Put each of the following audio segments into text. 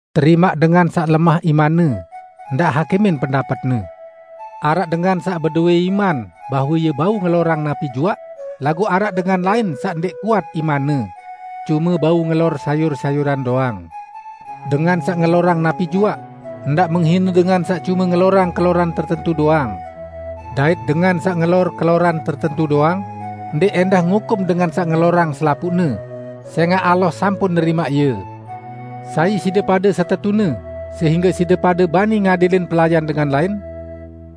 Terimaq dengan saq lemah imanne, ndaq hakimin pendapetne. Araq dengan saq bedowẽ iman bahwe ie bau ngelorang napi juaq, laguq araq dengan lain saq ndẽq kuat imanne; cume bau ngelor sayur-sayuran doang. Dengan saq ngelorang napi juaq, ndaq menghine dengan saq cume ngelorang keloran tertentu doang. Dait dengan saq ngelor keloran tertentu doang, ndẽq ẽndah ngukum dengan saq ngelorang selapuqne, sẽngaq Allah sampun nerimaq ie. Sai side pade setetune sehingge side pade bani ngadilin pelayan dengan lain?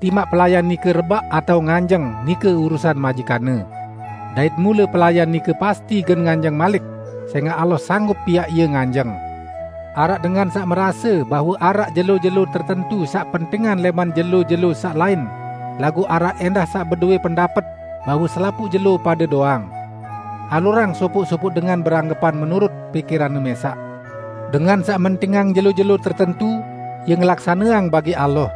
Timaq pelayan nike rebaq atao nganjeng, nike urusan majikanne. Dait mule pelayan nike pasti gen nganjeng malik sẽngaq Allah sanggup piaq ie nganjeng. Araq dengan saq merase bahwe araq jelo-jelo tertentu saq pentingan lẽman jelo-jelo saq lain, laguq araq ẽndah saq bedowẽ pendapet bahwe selapuq jelo pade doang. Alurang sopoq-sopoq dengan beranggepan menurut pikiranne mẽsaq. Dengan saq mentingang jelo-jelo tertentu ie ngelaksaneang bagi Allah.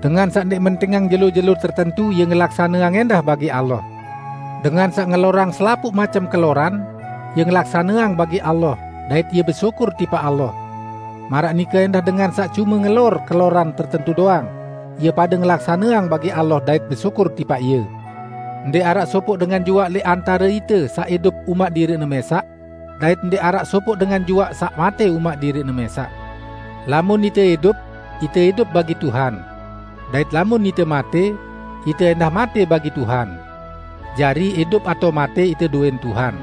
Dengan saq ndẽq mentingang jelo-jelo tertentu ie ngelaksaneang ẽndah bagi Allah. Dengan saq ngelorang selapuq macem keloran, ie ngelaksaneang bagi Allah dait ie besyukur tipaq Allah. Maraq nike ẽndah dengan saq cume ngelor keloran tertentu doang, ie pade ngelaksaneang bagi Allah dait besyukur tipaq Ie. Ndẽq araq sopoq dengan juaq lẽq antare ite saq idup umaq diriqne mẽsaq; dait ndẽq araq sopoq dengan juaq saq matẽ umaq diriqne mẽsaq. Lamun ite idup, ite idup bagi Tuhan. Dait lamun ite matẽ, ite ẽndah matẽ bagi Tuhan. Jari, idup atao matẽ, ite dowẽn Tuhan.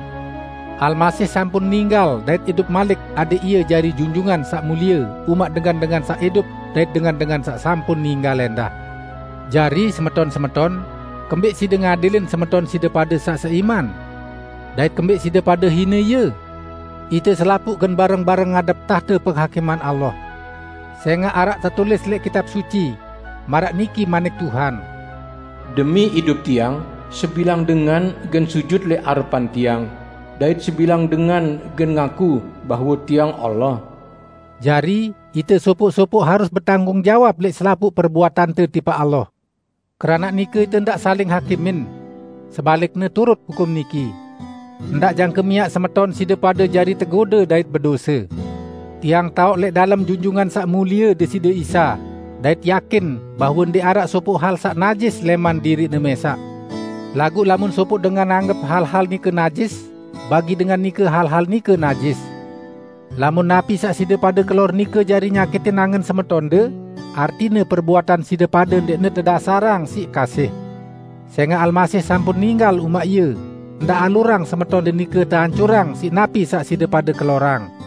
Almasih sampun ninggal dait idup malik adẽq Ie jari Junjungan Saq Mulie umaq dengan-dengan saq idup dait dengan-dengan saq sampun ninggal ẽndah. Jari, semeton-semeton, kembẽq side ngadilin semeton side pade saq seiman? Dait kembẽq side pade hine ie? Ite selapuq gen bareng-bareng ngadep tahte penghakiman Allah. Sẽngaq araq tetulis lẽq Kitab Suci, maraq niki manik Tuhan, "Demi idup Tiang, sebilang dengan gen sujut lẽq arepan Tiang, dait sebilang dengan gen ngaku bahwe Tiang Allah." Jari, ite sopoq-sopoq harus betanggung jawab lẽq selapuq perbuatante tipaq Allah. Keranaq nike ite ndaq saling hakimin. Sebalikne turut hukum niki: Ndaq jangke miaq semeton side pade jari tegode dait bedose. Tiang taoq lẽq dalem Junjungan Saq Mulie Deside Isa, dait yakin bahwe ndẽq araq sopoq hal saq najis lẽman diriqne mẽsaq; laguq lamun sopoq dengan anggep hal-hal nike najis, bagi dengan nike hal-hal nike najis. Lamun napi saq side pade kelor nike jari nyakitin angen semeton side pade, artine perbuatan side pade ndẽqne atas dasar kasih. Sẽngaq Almasih sampun ninggal umaq ie, ndaq alurang semeton side pade nike teancurang siq napi saq side pade kelorang.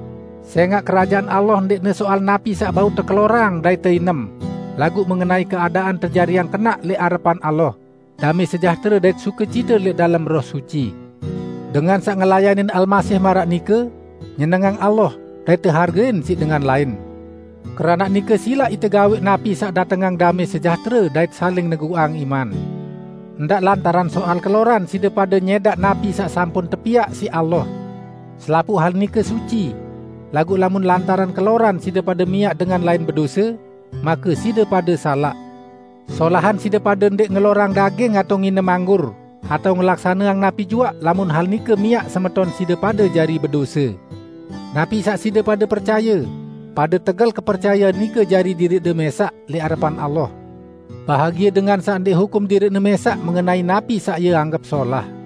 Sẽngaq Kerajaan Allah ndẽqne soal napi saq bau tekelorang dait teinem, laguq mengenai keadaan tejariang kenaq lẽq arepan Allah, damẽ sejahtere dait sukecite lẽq dalem Roh Suci. Dengan saq ngelayanin Almasih maraq nike, nyenengang Allah dait tehargein siq dengan lain. Keranaq nike silaq ite gawẽq napi saq datengang damẽ sejahtere dait saling neguqang iman. Ndaq lantaran soal keloran side pade nyẽdaq napi saq sampun tepiaq siq Allah. Selapuq hal nike suci; laguq lamun lantaran keloran side pade miaq dengan lain bedose, make side pade salaq. Solahan side pade ndẽq ngelorang daging atao nginem anggur, atao ngelaksaneang napi juaq lamun hal nike miaq semeton side pade jari bedose. Napi saq side pade percaye, pade tegel kepercayean nike jari diriqde mẽsaq lẽq arepan Allah. Bahagie dengan saq ndẽq hukum diriqne mẽsaq mengenai napi saq ie anggep solah.